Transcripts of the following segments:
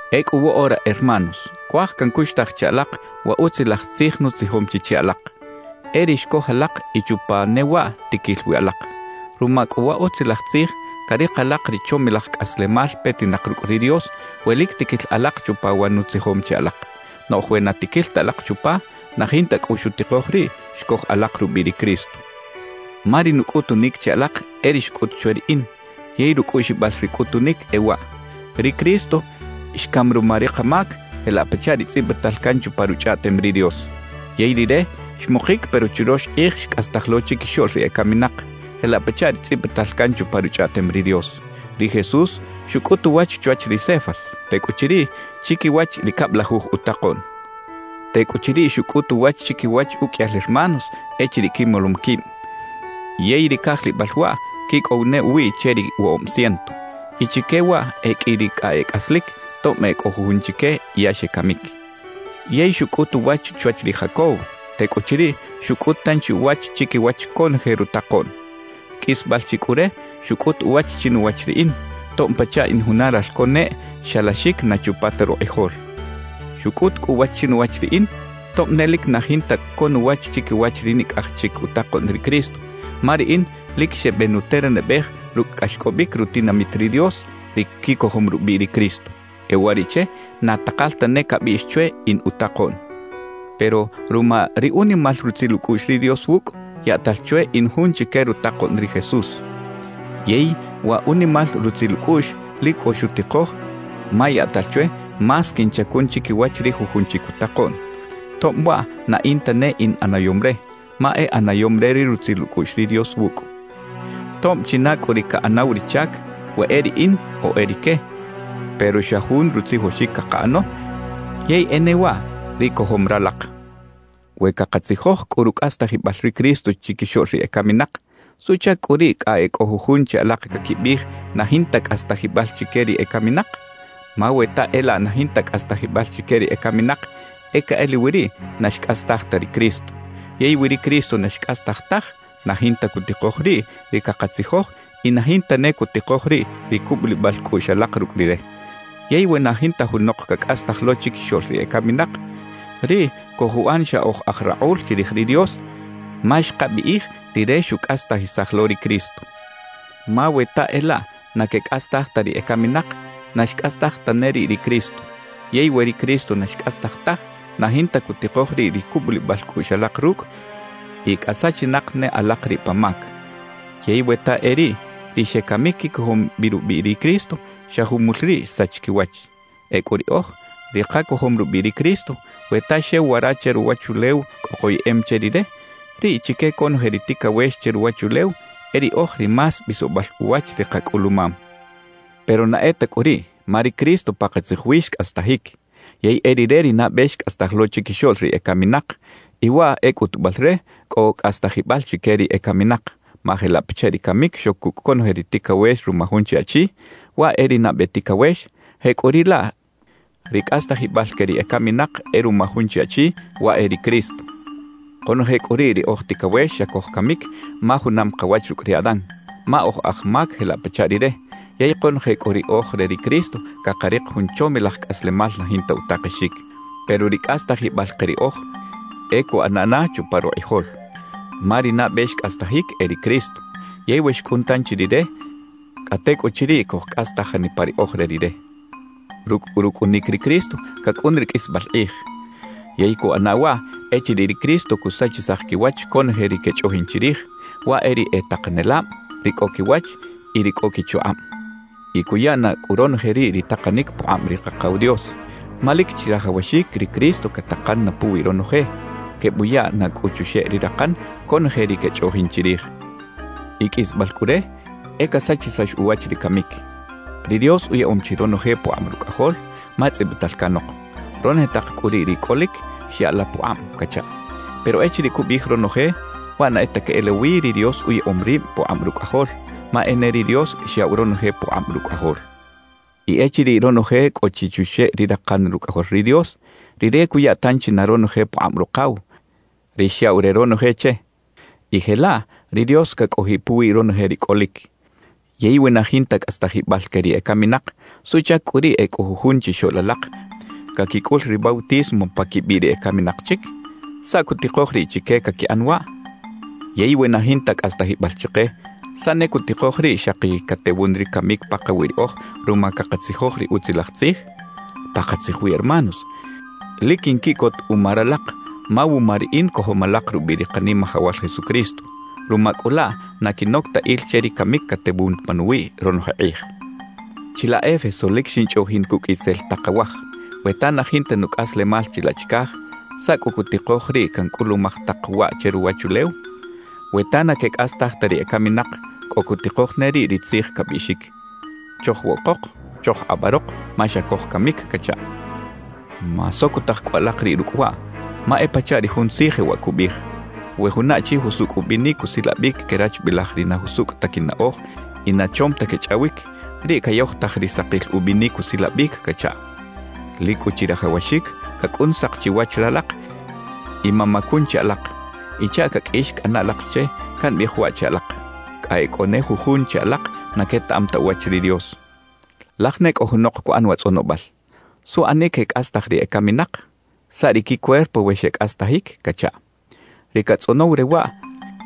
Ecꞌu woꞌora, hermanos, cuaj cancuxtaj che alak wa Utzilaj Tzij nutzijom chi che alak; e ri xcoj alak y chupa ne waꞌ tiquil wi alak. Ruma cꞌu wa Utzilaj Tzij, carik alak ri chomilaj cꞌaslemal petinak rucꞌ ri Dios we lic tiquil alak chupa wa nutzijom che alak. Noꞌj we na tiquil ta alak chupa, na jinta cꞌu xutikoj riꞌ xcoj alak rubiꞌ ri Cristo. Ma ri nucꞌutunic che alak e ri xcꞌut chwe riꞌin, yey rucꞌuꞌxibal ri cꞌutunic e waꞌ: Ri Cristo xcam ruma ri kamac jelaꞌ pachaꞌ ri tzꞌibital can chupa Ruchꞌaꞌtem ri Dios. Yey Rire xmukic pero churox kꞌij xcꞌastaj lo chiquixoꞌl ri ecaminak, jelaꞌ pachaꞌ ri tzꞌibital can chupa Ruchꞌaꞌtem ri Dios. Ri Jesús xucꞌut uwach chwach ri Cefas; tecꞌuchiriꞌ, chiquiwach ri cablajuj utakoꞌn. Tecꞌuchiriꞌ xucꞌut uwach chiquiwach uqꞌuiyal hermanos echiriꞌ quimolom quib, yey ri cajlibal waꞌ quicꞌow ne uwiꞌ che ri woꞌob ciento. Y chique waꞌ e qꞌui ri cꞌa e cꞌaslic, tob e cꞌo jujun chique ya xecamic. Yey xucꞌut uwach chwach ri Jacobo; tecꞌuchiriꞌ xucꞌut tanchi uwach chiquiwach conoje rutakoꞌn. Qꞌuisbal chi cꞌu re, xucꞌut uwach chinuwach riꞌin, tob pachaꞌ in juna ralco neꞌ xalaxic na chupa ta rukꞌijol. Xucꞌut cꞌu uwach chinuwach riꞌin, tob ne lic na jinta co nuwach chiquiwach ri nicꞌaj chic utakoꞌn ri Cristo, ma riꞌin lic xebenuternabej rucꞌ cꞌaxcꞌobic rutinamit ri Dios, ri quicojom rubiꞌ ri Cristo. E uwariꞌche na takal tane cabiꞌx chwe in utakoꞌn. Pero ruma ri unimal rutzil ucꞌuꞌx ri Dios wucꞌ, yaꞌtal chwe in jun chique rutakoꞌn ri Jesús. Yey wa unimal rutzil ucꞌuꞌx lic cꞌo xutikoj ma yaꞌtal chwe más quinchacun chiquiwach ri jujun chic utakoꞌn; tob waꞌ na in tane in ꞌanayom re, ma e ꞌanayom re ri rutzil ucꞌuꞌx ri Dios wucꞌ. Tob china cꞌu ri caꞌanaw ri chac, we e riꞌin o e rique, pero xa jun rutzijoxic cakaꞌano; yey e ne waꞌ ri cojom ralak. We cakatzijoj cꞌu rucꞌastajibal ri Cristo chiquixoꞌl ri ecaminak, ¿suꞌchac cꞌu riꞌ cꞌa e cꞌo jujun che alak caquibiꞌij na jinta cꞌastajibal chique ri ecaminak? Ma we ta e laꞌ na jinta cꞌastajibal chique ri ecaminak, e queꞌelawi riꞌ na xcꞌastaj ta ri Cristo. Yey we ri Cristo na xcꞌastaj taj, na jinta cutikoj riꞌ ri cakatzijoj y na jinta ne cutikoj riꞌ ri cubulibal cꞌuꞌx alak rucꞌ Rire. Yey we na jinta junok cacꞌastaj lo chiquixoꞌl ri ecaminak, riꞌ cojuꞌan xa oj aj rakꞌul chirij ri Dios ma xkabiꞌij Rire xucꞌastajisaj lo ri Cristo. Ma we ta e laꞌ na quecꞌastaj ta ri ecaminak, na xcꞌastaj tane riꞌ ri Cristo. Yey we ri Cristo na xcꞌastaj taj, na jinta cutikoj riꞌ ri cubulibal cꞌuꞌx alak rucꞌ y cꞌa sachinak ne alak riꞌ pa mac. Yey we ta e riꞌ, ri xecamic quicojom bi rubiꞌ ri Cristo, xa jumul riꞌ xsach quiwach. Ecꞌu riꞌoj, ri kacojom rubiꞌ ri Cristo, we ta xew wara che ruwachulew cꞌo koyeꞌem che Rire, riꞌ chique conoje ri ticawex che ruwachulew e riꞌoj ri más bisobal uwach ri kacꞌulumam. Pero na e ta cꞌu riꞌ, ma ri Cristo pakatzij wi xcꞌastajic. Yey e Rire ri nabe xcꞌastaj lo chiquixoꞌl ri ecaminak, y waꞌ e cꞌutubal re cꞌo cꞌastajibal chique ri ecaminak. Ma jelaꞌ pachaꞌ ri camic xoc cucꞌ conoje ri ticawex ruma jun chi achi, waꞌ e ri nabe ticawex; jecꞌuriꞌlaꞌ ri cꞌastajibal que ri ecaminak e ruma jun chi Achi, waꞌ e ri Cristo. Konoje cꞌu riꞌ ri oj ticawex xa cojcamic ma junam kawach rucꞌ ri Adán, ma oj aj mac jelaꞌ pachaꞌ rire; yey konoje cꞌu ri oj re ri Cristo, cakarik jun chomilaj cꞌaslemal na jinta utakexic. Pero ri cꞌastajibal ke riꞌoj, e cuꞌana na chupa rukꞌijol. Ma ri nabe xcꞌastajic e ri Cristo, yey we xcꞌun tanchi Rire, cꞌa tecꞌuchiriꞌ cojcꞌastaj janipa ri oj re Rire. Rucꞌ cꞌu rucꞌunic ri Cristo, cacꞌun ri qꞌuisbal kꞌij. Yey cuꞌana waꞌ echiriꞌ ri Cristo cusachisaj quiwach conoje ri quechꞌoꞌjin chirij; waꞌ e ri e takanelab, ri cꞌo quiwach y ri cꞌo quichukꞌab. Y cuya na cꞌu ronoje riꞌ ri takanic pukꞌab ri Kakaw Dios. Ma lic chirajawaxic ri Cristo catakan na puwi ronoje, quebuya na cꞌu chuxeꞌ ri rakan conoje ri quechꞌoꞌjin chirij. Y qꞌuisbal cꞌu re, e casachisax uwach ri camic. Ri Dios uyaꞌom chi ronoje pukꞌab Rucꞌajol, ma tzꞌibital canok: «Ronoje tak cꞌu riꞌ ri cꞌolic, xya la pukꞌab» cachaꞌ. Pero echiriꞌ cubiꞌij «ronoje», waꞌ na e ta queꞌelawi ri Dios uyaꞌom rib pukꞌab Rucꞌajol, ma e ne ri Dios xyaꞌw ronoje pukꞌab Rucꞌajol. Y echiriꞌ ronoje cꞌo chi chuxeꞌ ri rakan Rucꞌajol ri Dios, Rire cuya tanchi na ronoje pukꞌab Rukaw, ri xyaꞌw re ronoje che; y jelaꞌ ri Dios cacꞌojiꞌ puwi ronoje ri cꞌolic. Yey we na jinta cꞌastajibal que ri ecaminak, ¿suꞌchac cꞌu riꞌ e cꞌo jujun chixoꞌl alak caquicꞌul ri bautismo pa quibiꞌ ri ecaminak chic? ¿Saꞌ cutikoj riꞌ chique caquiꞌan waꞌ? Yey we na jinta cꞌastajibal chike, ¿saꞌ ne cutikoj riꞌ xaki catewun ri camic pakawiꞌ riꞌoj ruma cakatzijoj ri Utzilaj Tzij? Pakatzij wi hermanos, lic quinquiꞌcot uma ralak, ma wuma riꞌin cojom alak rubiꞌ ri Kanimajawal Jesucristo. Ruma cꞌu laꞌ na quinoc ta il che ri camic catewun panuwiꞌ ronoje kꞌij. Chilaꞌ Éfeso lic xinchꞌoꞌjin cucꞌ “itzel tak awaj”. We ta na jinta nucꞌaslemal chilaꞌ chicaj, ¿saꞌ cꞌu cutikoj riꞌ cancꞌulumaj tak waꞌ che ruwachulew? We ta na quecꞌastaj ta ri ecaminak, cꞌo cutikoj ne riꞌ ri tzij cabiꞌxic: Chojwoꞌkok, chojkꞌabarok ma xa cojcamic cachaꞌ. Masocotaj cꞌu alak riꞌ rucꞌ waꞌ; ma e pachaꞌ ri jun tzij jewaꞌ cubiꞌij: «We juna achi jusucꞌ ubinic usilabic querachbilaj ri na jusucꞌ ta quinaꞌoj y na chom ta quechꞌawic, riꞌ cayojtaj ri sakil ubinic usilabic» cachaꞌ. Lic cꞌu chirajawaxic cacꞌun sak chiwach ralak y mamacun chi alak. Y chaꞌ caqꞌuix cꞌana alak che, cambiꞌij waꞌ che alak: Cꞌa e cꞌo ne jujun che alak na quetaꞌam ta uwach ri Dios. Laj ne cꞌo junok cuꞌan wa tzꞌonobal: «¿Suꞌanic quecꞌastaj ri ecaminak? ¿Saꞌ ri quicuerpo we xecꞌastajic?» cachaꞌ. Ri catzꞌonow re waꞌ,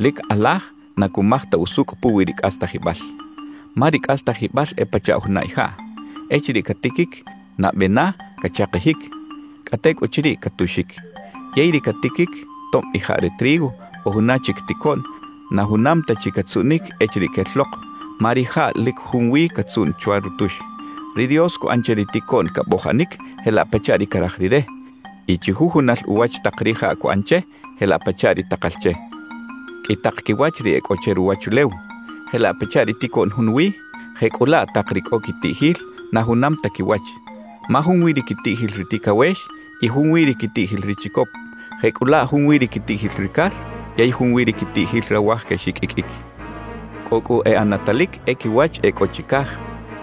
lic kꞌalaj na cumaj ta usucꞌ puwi ri cꞌastajibal. Ma ri cꞌastajibal e pachaꞌ juna ijaꞌ. Echiriꞌ catiquic, nabe na cachakijic; cꞌa tecꞌuchiriꞌ catuxic. Yey ri catiquic, tob ijaꞌ re trigo o juna chic ticoꞌn, na junam ta chi catzuꞌnic echiriꞌ quel lok, ma rijaꞌ lic junwi catzuꞌn chwa rutux. Ri Dios cuꞌan che ri ticoꞌn cabojanic jelaꞌ pachaꞌ ri caraj Rire, y chujujunal uwach tak rijaꞌ cuꞌan che jelaꞌ pachaꞌ ri takal che. Qꞌui tak quiwach ri e cꞌo che ruwachulew. Jelaꞌ pachaꞌ ri ticoꞌn junwi, jecꞌulaꞌ tak ri cꞌo quitiꞌjil, na junam ta quiwach. Ma junwi ri quitiꞌjil ri ticawex y junwi ri quitiꞌjil ri chicop; jecꞌulaꞌ junwi ri quitiꞌjil ri car yey junwi ri quitiꞌjil rawaj quexiqꞌuiqꞌuic. Cꞌo cꞌu e ꞌanatalic e quiwach e cꞌo chicaj,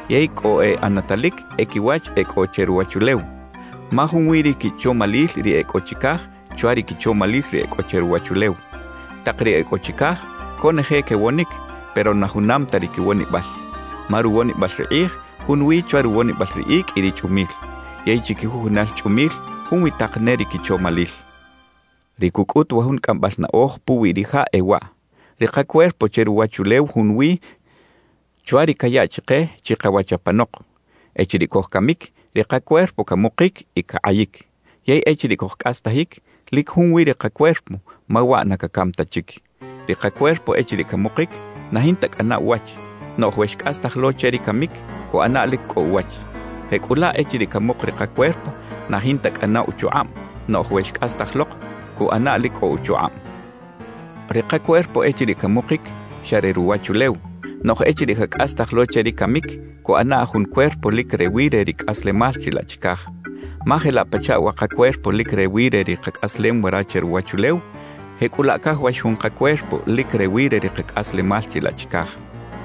yey cꞌo e ꞌanatalic e quiwach e cꞌo che ruwachulew. Ma junwi ri quichomalil ri e cꞌo chicaj chwa ri quichomalil ri e cꞌo che ruwachulew. Tak ri e cꞌo chicaj, conoje quewonic, pero na junam ta ri quiwonibal. Ma ruwonibal ri kꞌij junwi chwa ruwonibal ri icꞌ y ri chꞌumil. Yey chiquijujunal chꞌumil junwi tak ne ri quichomalil. Ri cucꞌut wa jun cꞌambal naꞌoj puwi rijaꞌ e waꞌ: Ri kacuerpo che ruwachulew junwi chwa ri cayaꞌ chike chikawach apanok. Echiriꞌ cojcamic, ri kacuerpo camukic y cakꞌayic. Yey echiriꞌ cojcꞌastajic, lic junwi ri kacuerpo, ma waꞌ na cacam ta chic. Ri kacuerpo echiriꞌ camukic, na jinta cꞌana uwach. Noꞌj we xcꞌastaj lo che ri camic, cuꞌana lic cꞌo uwach. Jecꞌulaꞌ echiriꞌ camuk ri kacuerpo, na jinta cꞌana uchukꞌab; noꞌj we xcꞌastaj lok, cuꞌana lic cꞌo uchukꞌab. Ri kacuerpo echiriꞌ camukic, xa re ruwachulew; noꞌj echiriꞌ cacꞌastaj lo che ri camic, cuꞌana jun cuerpo lic rewi re ri cꞌaslemal chilaꞌ chicaj. Ma jelaꞌ pachaꞌ wa kacuerpo lic rewi re ri kacꞌaslem wara che ruwachulew, jecꞌulaꞌ cajawax jun kacuerpo lic rewi re ri kacꞌaslemal chilaꞌ chicaj.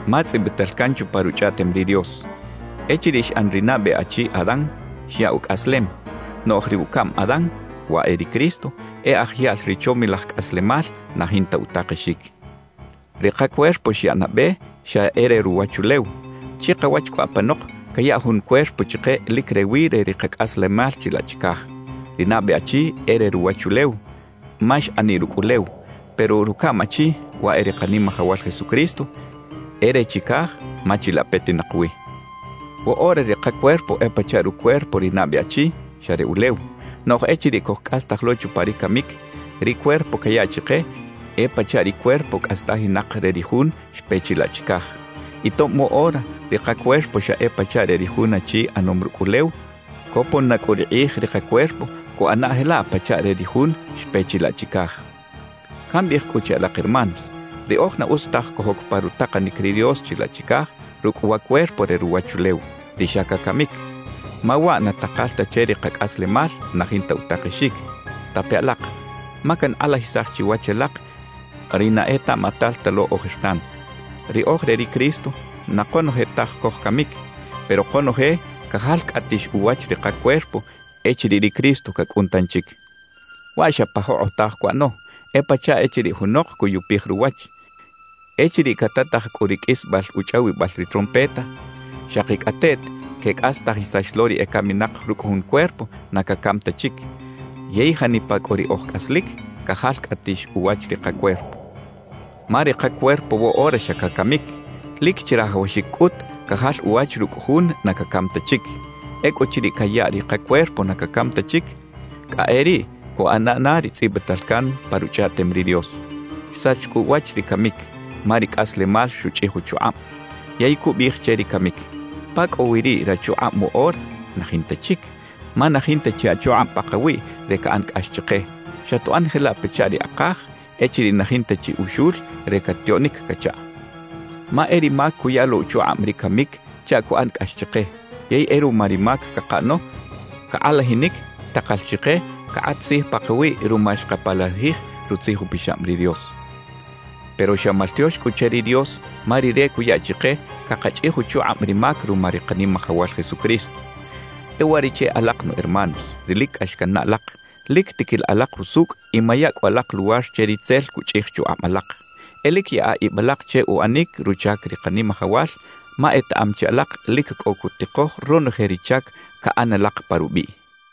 Ma tzꞌibital can chupa Ruchꞌaꞌtem ri Dios: “Echiriꞌ xꞌan ri nabe achi Adán, xyaꞌ ucꞌaslem.” Noꞌj ri “ucaꞌm Adán” (waꞌ e ri Cristo) e aj yaꞌl ri chomilaj cꞌaslemal na jinta utakexic. Ri kacuerpo xyaꞌ nabe, xa e re ruwachulew. Chikawach cꞌu apanok cayaꞌ jun cuerpo chike lic rewi re ri kacꞌaslemal chilaꞌ chicaj. Ri nabe achi e re ruwachulew, ma xꞌaniꞌ rucꞌ ulew. Pero rucaꞌm achi, waꞌ e ri Kanimajawal Jesucristo, e re chicaj ma chilaꞌ petinak wi. Woꞌora ri kacuerpo e pachaꞌ rucuerpo ri nabe achi, xa re ulew; noꞌj echiriꞌ cojcꞌastaj lo chupa ri camic, ri cuerpo cayaꞌ chike e pachaꞌ ri cuerpo cꞌastajinak re ri Jun xpe chilaꞌ chicaj. Y tob woꞌora ri kacuerpo xa e pachaꞌ re ri jun achi ꞌanom rucꞌ ulew, copon na cꞌu ri kꞌij ri kacuerpo cuꞌana jelaꞌ pachaꞌ re ri Jun xpe chilaꞌ chicaj. Cambiꞌij cꞌu che alak hermanos, riꞌoj na utz taj cojoc pa rutakanic ri Dios chilaꞌ chicaj rucꞌ wa cuerpo re ruwachulew, ri xa cacamic; ma waꞌ na takal ta che ri kacꞌaslemal na jinta utakexic. Tape alak, ma cankꞌalajisaj chiwach alak ri na etaꞌmatal ta lo ojertan. Ri oj re ri Cristo, na konoje taj cojcamic, pero konoje cajalcꞌatix uwach ri kacuerpo echiriꞌ ri Cristo cacꞌun tanchic. Waꞌ xa pa jokꞌotaj cuꞌano, e pachaꞌ echiriꞌ junok cuyupij ruwach. Echiriꞌ catataj cꞌu ri qꞌuisbal uchꞌawibal ri trompeta, xakicꞌateꞌt quecꞌastajisax lo ri ecaminak rucꞌ jun cuerpo na cacam ta chic; yey janipa cꞌu ri oj cꞌaslic, cajalcꞌatix uwach ri kacuerpo. Ma ri kacuerpo woꞌora xa cacamic. Lic chirajawaxic cꞌut cajal uwach rucꞌ jun na cacam ta chic. Ecꞌuchiriꞌ cayaꞌ ri kacuerpo na cacam ta chic, cꞌa e riꞌ cuꞌana na ri tzꞌibital can pa Ruchꞌaꞌtem ri Dios: Xsach cꞌu uwach ri camic, ma ri cꞌaslemal xuchꞌij uchukꞌab. Yey cubiꞌij che ri camic: ¿Pa cꞌo wi riꞌ rachukꞌab woꞌora? ¡Na jinta chic! Ma na jinta chi achukꞌab pakawiꞌ re caꞌan cꞌax chike, xatuꞌan jelaꞌ pachaꞌ ri akaj echiriꞌ na jinta chi uxul re catiꞌoꞌnic cachaꞌ. Ma e ri mac cuya lo uchukꞌab ri camic chaꞌ cuꞌan cꞌax chike. Yey e ruma ri mac cakaꞌano, cakꞌalajinic takal chike cakꞌat tzij pakawiꞌ ruma xkapalajij Rutzij Upixab ri Dios. Pero xa maltiox cꞌu che ri Dios, ma Rire cuya chike cakachꞌij uchukꞌab ri mac ruma ri Kanimajawal Jesucristo. E uwariꞌche alak nu hermanos, ri lic cꞌax cannaꞌ alak, lic tiquila alak jusucꞌ y maya cꞌu alak luwar che ritzel cuchꞌij chukꞌab alak. E lic yaꞌa ib alak che uꞌanic ruchac ri Kanimajawal, ma etaꞌam chi alak lic cꞌo cutikoj ronoje ri chac caꞌan alak pa rubiꞌ.